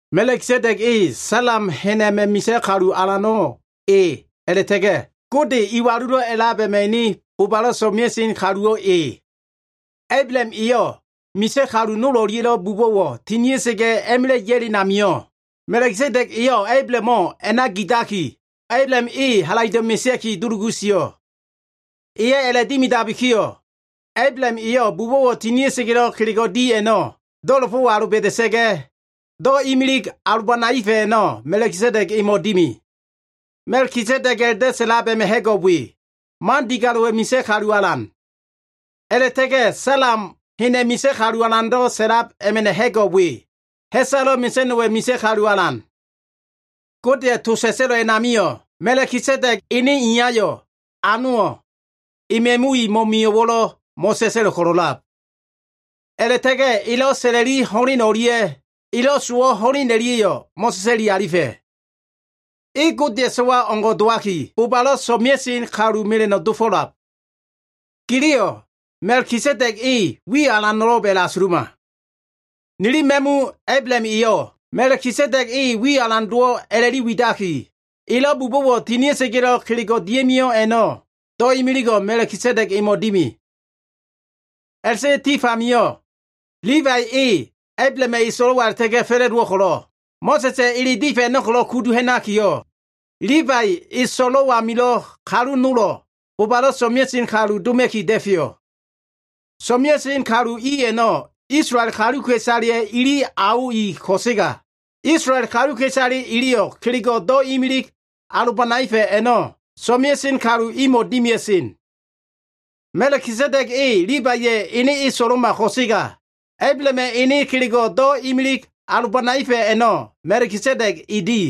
Ma꞉kisedeg e Salem hen a꞉ma꞉ misa꞉ kalu alano꞉ e a꞉la꞉ta꞉ga꞉, Gode Iwalulo꞉ A꞉lab a꞉ma꞉ ene bobalo꞉ so꞉mea꞉sen kaluwo꞉ e. Ablaham eyo꞉ misa꞉ kalu nol o꞉lia꞉lo꞉ bubo꞉wo꞉ tinia꞉sa꞉ga꞉ a꞉ma꞉la꞉ ya꞉len amio꞉, Ma꞉kisedeg eyo꞉ Ablahamo꞉ a꞉na gidaki, Ablaham e halaido꞉ mesea꞉ki dulugu sio꞉. Eyo꞉ a꞉la꞉dimidabikiyo꞉, Ablaham eyo꞉ bubo꞉wo꞉ tinia꞉sa꞉ga꞉lo꞉ kelego꞉ di a꞉no꞉ do꞉la꞉fo꞉ aloba꞉da꞉sa꞉ga꞉, do꞉ imilig alobanaefa꞉ a꞉no꞉ Ma꞉kisedeg emo꞉ dimi. Ma꞉kisedeg a꞉la꞉do꞉ sa꞉lab a꞉ma꞉ ha꞉go꞉ we, “Man digalo꞉wa꞉ misa꞉ kalu alan.” A꞉la꞉ta꞉ga꞉ Salem hena꞉ misa꞉ kalu alan a꞉la꞉do꞉ sa꞉lab a꞉ma꞉ ha꞉go꞉ we, “Ha꞉salo꞉ mesa꞉no꞉wa꞉ misa꞉ kalu alan.” Godeya꞉ to sa꞉sa꞉lo꞉ a꞉namio꞉, Ma꞉kisedeg ene iyayo꞉, anowo꞉, ema꞉mu i mo꞉mio꞉wo꞉lo꞉ mo꞉sa꞉sa꞉lo꞉ ko꞉lo꞉lab. A꞉la꞉ta꞉ga꞉ elo꞉ sa꞉la꞉li ho꞉len o꞉lia꞉ elo꞉ sowo꞉ ho꞉len o꞉lia꞉yo꞉ mo꞉sa꞉sa꞉li alifa꞉. E Godeya꞉ So꞉wayo꞉ o꞉ngo꞉ dowaki, bobalo꞉ so꞉mea꞉sen kalu mela꞉no꞉ dofo꞉lab. Giliyo꞉ Ma꞉kisedeg e wiyo꞉ alano꞉lo꞉b a꞉la꞉asuluma. Nili ma꞉mu Ablaham eyo꞉, Ma꞉kisedega꞉ wiyo꞉ alan dowo꞉ a꞉la꞉li widaki, elo꞉ bubo꞉wo꞉ tinia꞉sa꞉ga꞉lo꞉ kelego꞉ dia꞉mio꞉ a꞉no꞉ do꞉ imiligo꞉ Ma꞉kisedeg emo꞉ dimi. A꞉la꞉ta꞉ga꞉ tif amio꞉ Libai e Ablahama꞉ eso꞉lo꞉wa a꞉la꞉ta꞉ga꞉ fa꞉la꞉dowo꞉ ko꞉lo꞉, Mo꞉sa꞉sa꞉ ele difa꞉ a꞉no꞉ ko꞉lo꞉ kudu ha꞉nakiyo꞉, Libaiya꞉ e so꞉lo꞉ amilo꞉ kalu nolo꞉, bobalo꞉ so꞉mea꞉sen kalu doma꞉ki da꞉feyo꞉. So꞉mea꞉sen kalu i a꞉no꞉ Isolael kaluka꞉isaleya꞉ ili ao i ko꞉sega, Isolael kaluka꞉isale iliyo꞉ kelego꞉ do꞉ imilig alobanaefa꞉ a꞉no꞉ so꞉mea꞉sen kalu imo꞉ dimia꞉sen. Ma꞉kisedeg e Libaiya꞉ ene eso꞉lo꞉ma ko꞉sega, Ablahama꞉ ene kelego꞉ do꞉ imilig alobanaefa꞉ a꞉no꞉ Ma꞉kisedeg e di.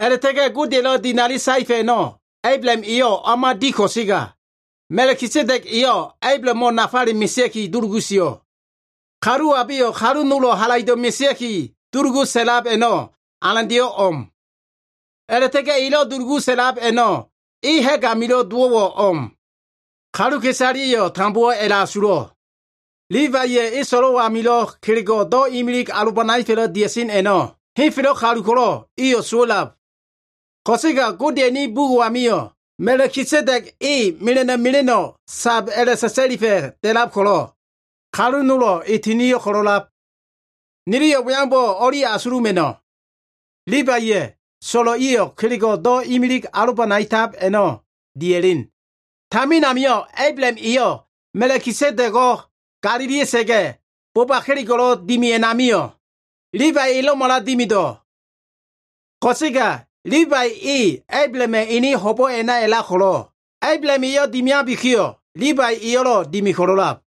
A꞉la꞉ta꞉ga꞉ Godeya꞉lo꞉ dinali saefa꞉ a꞉no꞉ Ablaham eyo꞉ o꞉ma di ko꞉sega, Ma꞉kisedeg eyo꞉ Ablahamo꞉ nafale mesea꞉ki dulugu sio꞉. Kalu abeyo꞉ kalu nolo꞉ halaido꞉ mesea꞉ki dulugu sa꞉lab a꞉no꞉ alandeyo꞉ o꞉m. A꞉la꞉ta꞉ga꞉ elo꞉ dulugu sa꞉lab a꞉no꞉ e ha꞉g amilo꞉ dowo꞉wo꞉ o꞉m. Kaluka꞉isaleya꞉yo꞉ tambowo꞉ a꞉la꞉asulo꞉. Libaiya꞉ eso꞉lo꞉ amilo꞉ kelego꞉ do꞉ imilig alobanaefa꞉lo꞉ dia꞉sen a꞉no꞉, henfelo꞉ kalu ko꞉lo꞉ iyo꞉ sowa꞉lab. Ko꞉sega Godeya꞉ ene bugo꞉ amio꞉ Ma꞉kisedeg e mela꞉no꞉ mela꞉no꞉ sab a꞉la꞉sa꞉sa꞉lifa꞉ da꞉lab ko꞉lo꞉, kalu nolo꞉ e tinio꞉ ko꞉lo꞉lab. Niliyo꞉ we aumbo꞉ o꞉li asuluma꞉no꞉. Libaiya꞉ so꞉lo꞉ iyo꞉ kelego꞉ do꞉ imilig alobanaetab a꞉no꞉ dia꞉len. Tamin amio꞉ Ablaham eyo꞉ Ma꞉kisedego꞉ galilia꞉sa꞉ga꞉, boba kelego꞉lo꞉ dimi a꞉namio꞉, Libai elo꞉mala dimido꞉. Ko꞉sega Libai e Ablahama꞉ ene ho꞉bo꞉ a꞉na a꞉lab ko꞉lo꞉, Ablaham eyo꞉ dimiabiyo꞉, Libai eyo꞉lo꞉ dimi ko꞉lo꞉lab.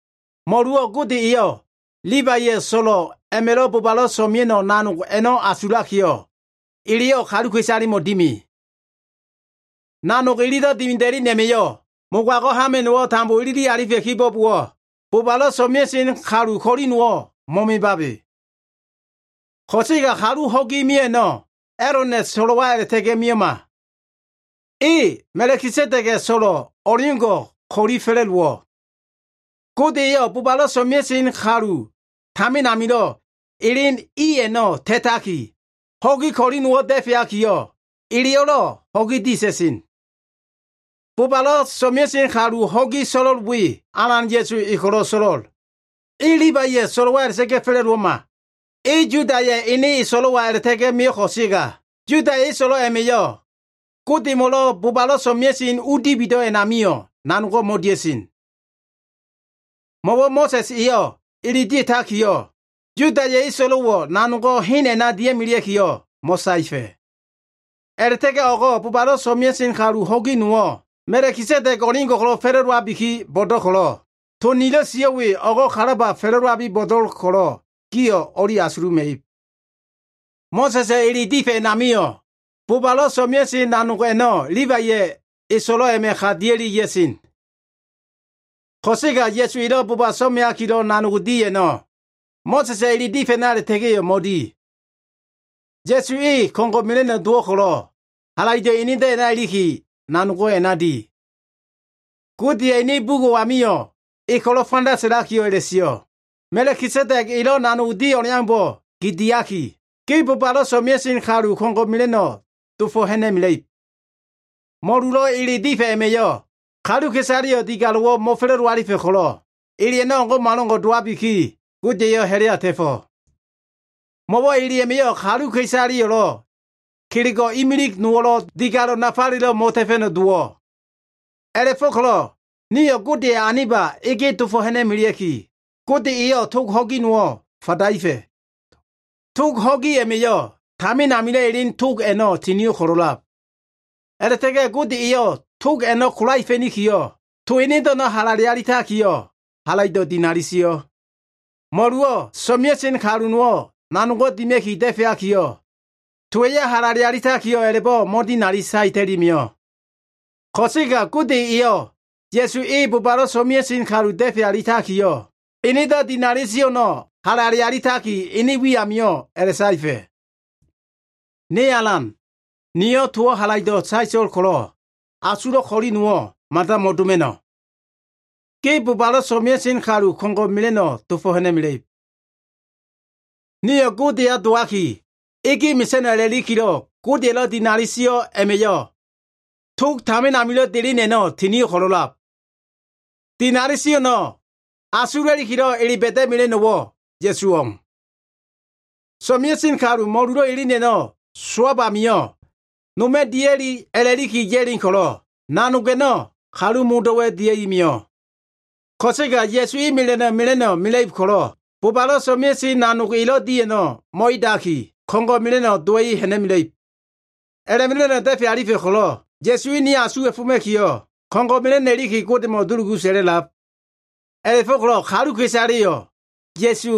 Mo꞉luwo꞉ Gode eyo꞉, Libaiya꞉ so꞉lo꞉ a꞉ma꞉lo꞉ bobalo꞉ so꞉mea꞉no꞉ nanog a꞉no꞉ asulakiyo꞉, eleyo꞉ kaluka꞉isalemo꞉ dimi. Nanog ililo꞉ dimida꞉len a꞉ma꞉yo꞉ mogago꞉ hama꞉no꞉wo꞉ tambo ilili alifa꞉ kibo꞉bowo꞉, bobalo꞉ so꞉mea꞉sen kalu ko꞉li nowo꞉ mo꞉mebabe. Ko꞉sega kalu ho꞉gi mio꞉ a꞉no꞉ A꞉lona꞉ so꞉lo꞉wa a꞉la꞉ta꞉ga꞉ mio꞉ma. E Ma꞉kisedega꞉ so꞉lo꞉ o꞉leo꞉ngo꞉ ko꞉li fa꞉la꞉dowo꞉. Gode eyo꞉ bobalo꞉ so꞉mea꞉sen kalu tamin amilo꞉ elen i a꞉no꞉ ta꞉taki, ho꞉gi ko꞉li nowo꞉ da꞉feakiyo꞉, eleyo꞉lo꞉ ho꞉gi dia꞉ta꞉sen. Bobalo꞉ so꞉mea꞉sen kalu ho꞉gi so꞉lo꞉l we, Alan Ya꞉su e ko꞉lo꞉ so꞉lo꞉l. E Libaiya꞉ so꞉lo꞉wa a꞉la꞉ta꞉ga꞉ fa꞉la꞉dowo꞉ma. E Yudaya꞉ ene eso꞉lo꞉wa a꞉la꞉ta꞉ga꞉ mio꞉ ko꞉sega, Yudaya꞉ eso꞉lo꞉ a꞉ma꞉yo꞉ Godemo꞉lo꞉ bobalo꞉ so꞉mea꞉sen u dibido꞉ a꞉namio꞉ nanogo꞉ mo꞉dia꞉sen. Mo꞉wo꞉ Mo꞉sa꞉s eyo꞉ ele dia꞉takiyo꞉, Yudaya꞉ eso꞉lo꞉wo꞉ nanogo꞉ hen a꞉na dia꞉melea꞉kiyo꞉ mo꞉saefa꞉. A꞉la꞉ta꞉ga꞉ o꞉go꞉ bobalo꞉ so꞉mea꞉sen kalu ho꞉gi nowo꞉, Ma꞉kisedeg o꞉leo꞉ngo꞉ ko꞉lo꞉ fa꞉la꞉dowabi bo꞉do꞉l ko꞉lo꞉, to nilo꞉ sio꞉ we o꞉go꞉ kalaba fa꞉la꞉dowab ko꞉lo꞉ gio꞉ o꞉li asuluma꞉ib. Mo꞉sa꞉sa꞉ ele difa꞉ a꞉namio꞉ bobalo꞉ so꞉mea꞉sen nanog a꞉no꞉ Libaiya꞉ eso꞉lo꞉ a꞉ma꞉ ka dia꞉li ya꞉sen. Ko꞉sega Ya꞉su elo꞉ boba so꞉meakilo꞉ nanog di a꞉no꞉, Mo꞉sa꞉sa꞉ ele difa꞉ a꞉na a꞉la꞉ta꞉ga꞉yo꞉ mo꞉di. Ya꞉su e ko꞉ngo꞉ mela꞉no꞉ dowo꞉ ko꞉lo꞉, halaido꞉ enedo꞉ a꞉na ilikiyo꞉ nanogo꞉ a꞉na di. Godeya꞉ ene bugo꞉ amio꞉ E ko꞉lo꞉ fanda sa꞉laki a꞉la꞉sio꞉, “Ma꞉kisedeg elo꞉ nanog di o꞉leaumbo꞉ gi diaki, Ge bobalo꞉ so꞉mea꞉sen kalu ko꞉ngo꞉ mela꞉no꞉ dofo꞉ ha꞉na꞉mela꞉ib.” Mo꞉lulo꞉ ele difa꞉ a꞉ma꞉yo꞉, kaluka꞉isaleyo꞉ digalo꞉wo꞉ mo꞉fa꞉la꞉do alifa꞉ ko꞉lo꞉, ele a꞉no꞉ o꞉ngo꞉malo꞉ngo꞉ dowabiki, Gode eyo꞉ ha꞉la꞉ya ta꞉fo꞉. Mo꞉wo꞉ ele a꞉ma꞉yo꞉ kaluka꞉isaleyo꞉lo꞉, kelego꞉ imilig nowo꞉lo꞉ digalo꞉ nafalelo꞉ mo꞉ta꞉fa꞉no꞉ dowo꞉. A꞉la꞉fo꞉ko꞉lo꞉ nio꞉ Godeya꞉ aniba ege dofo꞉ ha꞉na꞉melea꞉ki, Gode eyo꞉ tog ho꞉gi nowo꞉ fadaefa꞉. Tog ho꞉gi a꞉ma꞉yo꞉ tamin amilo꞉ elen tog a꞉no꞉ tinio꞉ ko꞉lo꞉lab. A꞉la꞉ta꞉ga꞉ Gode eyo꞉ tog a꞉no꞉ kolaefa꞉nikiyo꞉, to enedo꞉ a꞉no꞉ halale alitakiyo꞉, halaido꞉ dinali sio꞉. Mo꞉luwo꞉ so꞉mea꞉sen kalu nowo꞉ nanog dima꞉ki da꞉feakiyo꞉, towa꞉yo꞉ halale alitakiyo꞉ a꞉la꞉bo꞉ mo꞉dinali saeta꞉i mio꞉. Ko꞉sega Gode eyo꞉ Ya꞉su e bobalo꞉ so꞉mea꞉sen kalu da꞉fe alitakiyo꞉, enedo꞉ dinali sio꞉ a꞉no꞉ halale alitaki, ene wi amio꞉ a꞉la꞉saefa꞉. “Ne Alan, niyo꞉ towo꞉ halaido꞉ saeto꞉l ko꞉lo꞉, asulo꞉ ko꞉li no꞉wo꞉ mada mo꞉doma꞉no꞉. ‘Ge bobalo꞉ so꞉mea꞉sen kalu ko꞉ngo꞉ mela꞉no꞉ dofo꞉ ha꞉na꞉mela꞉ib.’” Nio꞉ Godeya dowaki ege mesa꞉no꞉ a꞉la꞉likilo꞉ Godeya꞉lo꞉ dinali sio꞉ a꞉ma꞉yo꞉ tog tamin amilo꞉ delen a꞉no꞉ tinio꞉ ko꞉lo꞉lab. Dinali sio꞉ a꞉no꞉ asula꞉likilo꞉ ele ba꞉da꞉mela꞉no꞉wo꞉ Ya꞉su o꞉m. So꞉mea꞉sen kalu mo꞉lulo꞉ elen a꞉no꞉ sowab amio꞉ noma꞉ dia꞉li a꞉la꞉li ya꞉len ko꞉lo꞉, nanog a꞉no꞉ kalu modo꞉wa꞉ dia꞉i mio꞉. Ko꞉sega Ya꞉su e ko꞉ngo꞉ mela꞉no꞉ mela꞉ib ko꞉lo꞉, bobalo꞉ so꞉mea꞉sen nanog elo꞉ di a꞉no꞉ mo꞉edaki, ko꞉ngo꞉ mela꞉no꞉ dowa꞉i ha꞉na꞉mela꞉ib. A꞉la꞉ma꞉no꞉ da꞉fe alifa꞉ ko꞉lo꞉, Ya꞉su e ni asuwa꞉foma꞉kiyo꞉, ko꞉ngo꞉ mela꞉no꞉ iliki Godemo꞉ dulugu sa꞉la꞉lab. A꞉la꞉fo꞉ko꞉lo꞉ kaluka꞉isaleyo꞉ Ya꞉su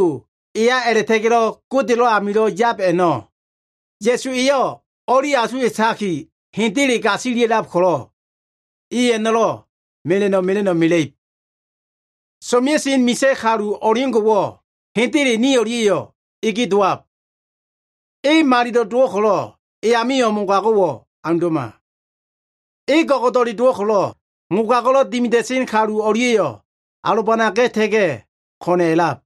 eya a꞉la꞉ta꞉ga꞉ Godelo꞉ amilo꞉ yab a꞉no꞉, Ya꞉su eyo꞉ o꞉li asuwa꞉taki hendele gasilia꞉lab ko꞉lo꞉, i a꞉no꞉lo꞉ mela꞉no꞉ mela꞉no꞉ mela꞉ib. So꞉mea꞉sen misa꞉ kalu o꞉leo꞉ngo꞉wo꞉ hendele ni o꞉lia꞉yo꞉ ege dowab. E malilo꞉ dowo꞉ ko꞉lo꞉, e amio꞉ mogago꞉wo꞉ aundo꞉ma. E go꞉go꞉do꞉le dowo꞉ ko꞉lo꞉, mogago꞉lo꞉ dimida꞉sen kalu o꞉lia꞉yo꞉ alobanaga꞉ta꞉ga꞉ ko꞉na꞉ a꞉lab.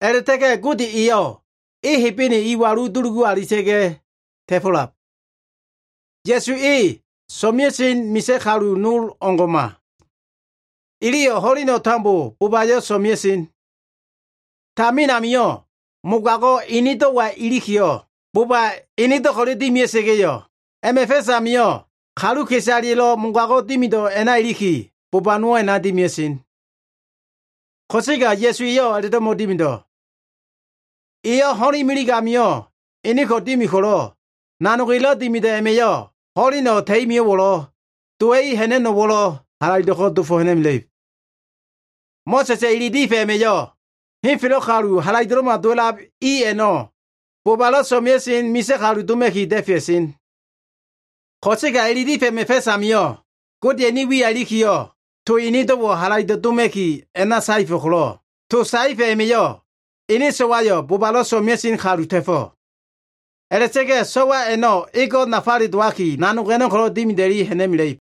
A꞉la꞉ta꞉ga꞉ Gode eyo꞉ e Hebene iwalu dulugu alita꞉ga꞉ ta꞉fo꞉lab. Ya꞉su e so꞉mea꞉sen misa꞉ kalu nol o꞉ngo꞉ma. Iliyo꞉ ho꞉leno꞉ tambo bobayo꞉ so꞉mea꞉sen. Tamin amio꞉ mogago꞉ enedo꞉wa ilikiyo꞉, boba enedo꞉ ko꞉le dimia꞉sa꞉ga꞉yo꞉, a꞉ma꞉ fa꞉s amio꞉ kaluka꞉isaleya꞉lo꞉ mogago꞉ dimido꞉ a꞉na iliki, boba nowo꞉ a꞉na dimia꞉sen. Ko꞉sega Ya꞉su eyo꞉ a꞉la꞉do꞉ mo꞉dimido꞉. Eyo꞉ ho꞉len imilig amio꞉ eneko꞉ dimi ko꞉lo꞉, nanog elo꞉ dimido꞉ a꞉ma꞉yo꞉ ho꞉leno꞉ ta꞉i mio꞉wo꞉lo꞉, dowa꞉i ha꞉na꞉no꞉wo꞉lo꞉ halaido꞉ko꞉ dofo꞉ ha꞉na꞉mela꞉ib. Mo꞉sa꞉sa꞉ ele difa꞉ a꞉ma꞉yo꞉, henfelo꞉ kalu halaido꞉lo꞉ma dowa꞉lab i a꞉no꞉ bobalo꞉ so꞉mea꞉sen misa꞉ kalu doma꞉ki da꞉fea꞉sen. Ko꞉sega ele difa꞉ a꞉ma꞉ fa꞉s amio꞉, Godeya꞉ ene wiya ilikiyo꞉, to enedo꞉wo꞉ halaido꞉ doma꞉ki a꞉na saefa꞉ ko꞉lo꞉, to saefa꞉ a꞉ma꞉yo꞉ ene so꞉wayo꞉ bobalo꞉ so꞉mea꞉sen kalu ta꞉fo꞉. A꞉la꞉ta꞉ga꞉ so꞉wa a꞉no꞉ ego꞉ nafale dowaki, nanog a꞉no꞉ ko꞉lo꞉ dimida꞉i ha꞉na꞉mela꞉ib.